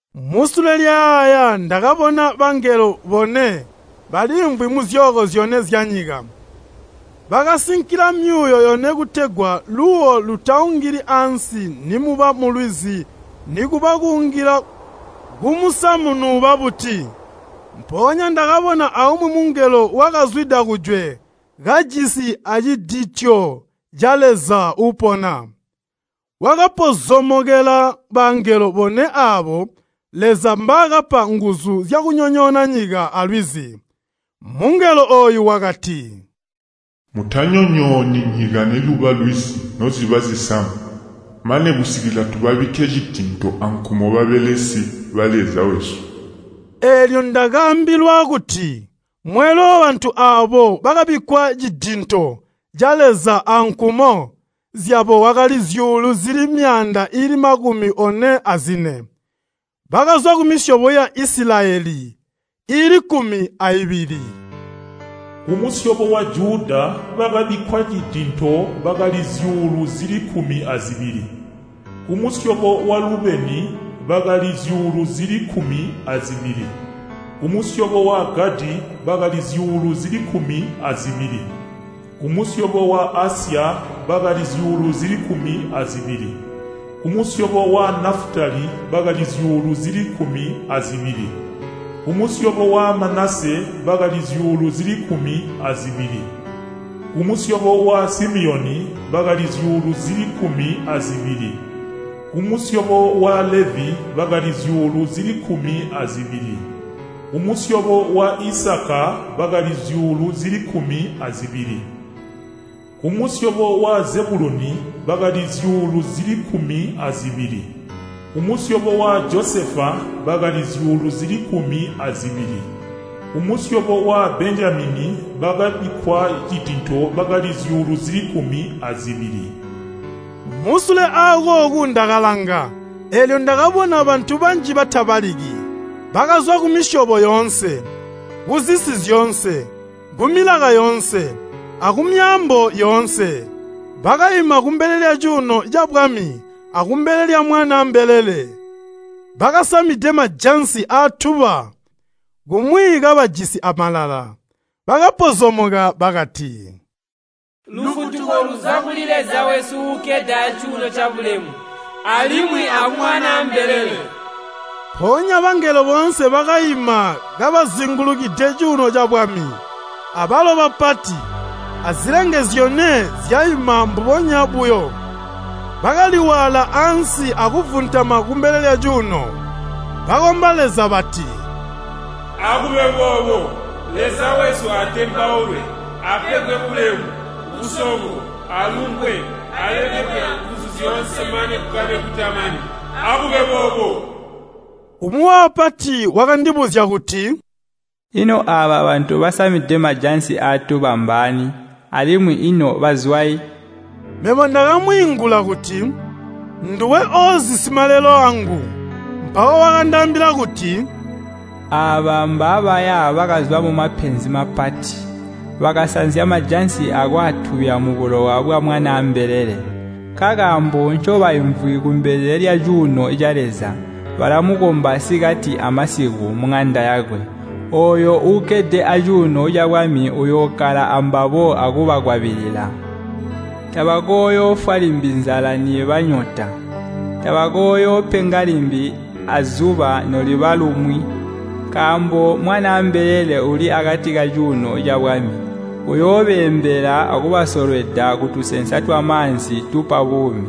Musule lyayaaya ndakabona bangelo bone baliimvwi muzyooko zyone zyanyika. Bakasinkila myuuwo yone kutegwa luuwo lutaungili ansi nimuba mulwizi nikuba kuungila kumusamu nuuba buti. Mpoonya ndakabona aumwi mungelo wakazwida kujwe kajisi acidityo ca Leza uupona. Wakapozomokela bangelo bone aabo Leza mbaakapa nguzu zyakunyonyoona nyika alwizi. Mungelo ooyu wakati, “Mutanyonyooni nyika niluba lwizi noziba zisamu, mane kusikila tubabikke cidinto ankumo babelesi ba Leza wesu.” Eelyo ndakaambilwa kuti mweelwe wabantu aabo bakabikkwa cidinto ca Leza ankumo zyabo wakali zyuulu zili myaanda iili makumi one azine. Bakazwa kumisyobo ya Isilayeli iili kkumi aibili. Kumusyobo wa Juda, bakabikkwa cidinto bakali zyuulu zili kkumi azibili. Kumusyobo wa Lubeni bakali zyuulu zili kkumi azibili. Kumusyobo wa Gadi, bakali zyuulu zili kkumi azibili. Kumusyobo wa Asya bakali zyuulu zili kkumi azibili. Kumusyobo wa Nafutali bakali zyuulu zili kkumi azibili. Kumusyobo wa Manase bakali zyuulu zili kkumi azibili. Kumusyobo wa Simiyoni bakali zyuulu zili kkumi azibili. Kumusyobo wa Levi bakali zyuulu zili kkumi azibili. Kumusyobo wa Isakaa bakali zyuulu zili kkumi azibili. Kumusyobo wa Zebuluni bakali zyuulu zili kkumi azibili. Kumusyobo wa Josefa bakali zyuulu zili kkumi azibili. Kumusyobo wa Benjamini bakabikkwa cidinto bakali zyuulu zili kkumi azibili. Musule akooku ndakalanga eelyo ndakabona bantu banji batabaliki. Bakazwa kumisyobo yoonse, kuzisi zyoonse, kumilaka yoonse, akumyaambo yoonse. Bakaima kumbele lyacuuno cabwami akumbele lya Mwanaa mbelele, bakasamide majansi aatuba kumwi kabajisi amalala. Bakapozomoka bakati, “Lufutuko luzwa kuli Leza wesu uukkede acuuno cabulemu alimwi aku Mwanaa mbelele!” Mpoonya bangelo boonse bakaima kabazingulukide cuuno cabwami. Abalo bapati, azilenge zyone zyaima mbubonya buyo. Bakali waala ansi akuvuntama kumbele lyacuuno, bakomba Leza bati, “Akube boobo!” Leza wesu atembaulwe, apegwe bulemu, busongo, alumbwe, alemekwe anguzu zyoonse mane kukabe kutamani. Akube boobo. Umwi wabapati wakandibuzya kuti, “Ino aaba bantu basamide majansi aatuba mbaani, alimwi ino bazwayi?” Mebo ndakamwiingula kuti, “Nduwe oozi simalelo wangu.” Mpawo wakandaambila kuti, “Aaba mbaabaya bakazwa mumapenzi mapati. Bakasanzya majansi akwaatubya mubulowa bwa Mwanaa mbelele. Nkakaambo ncobaimvwi kumbele lyacuuno ca Leza, balamukomba sikati amasiku muŋanda yakwe. Ooyo uukkede acuuno cabwami uyookkala ambabo akubakwabilila. Tabakooyoofwa limbi nzala niiba nyota, tabakooyoopenga limbi azuba noluba lumwi. Nkaambo Mwanaa mbelele uuli akati kacuuno cabwami, uyoobeembela akubasolweda kutusensa twamaanzi tupa buumi.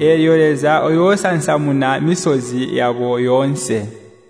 Eelyo Leza uyoosansamuna misozi yabo yoonse.”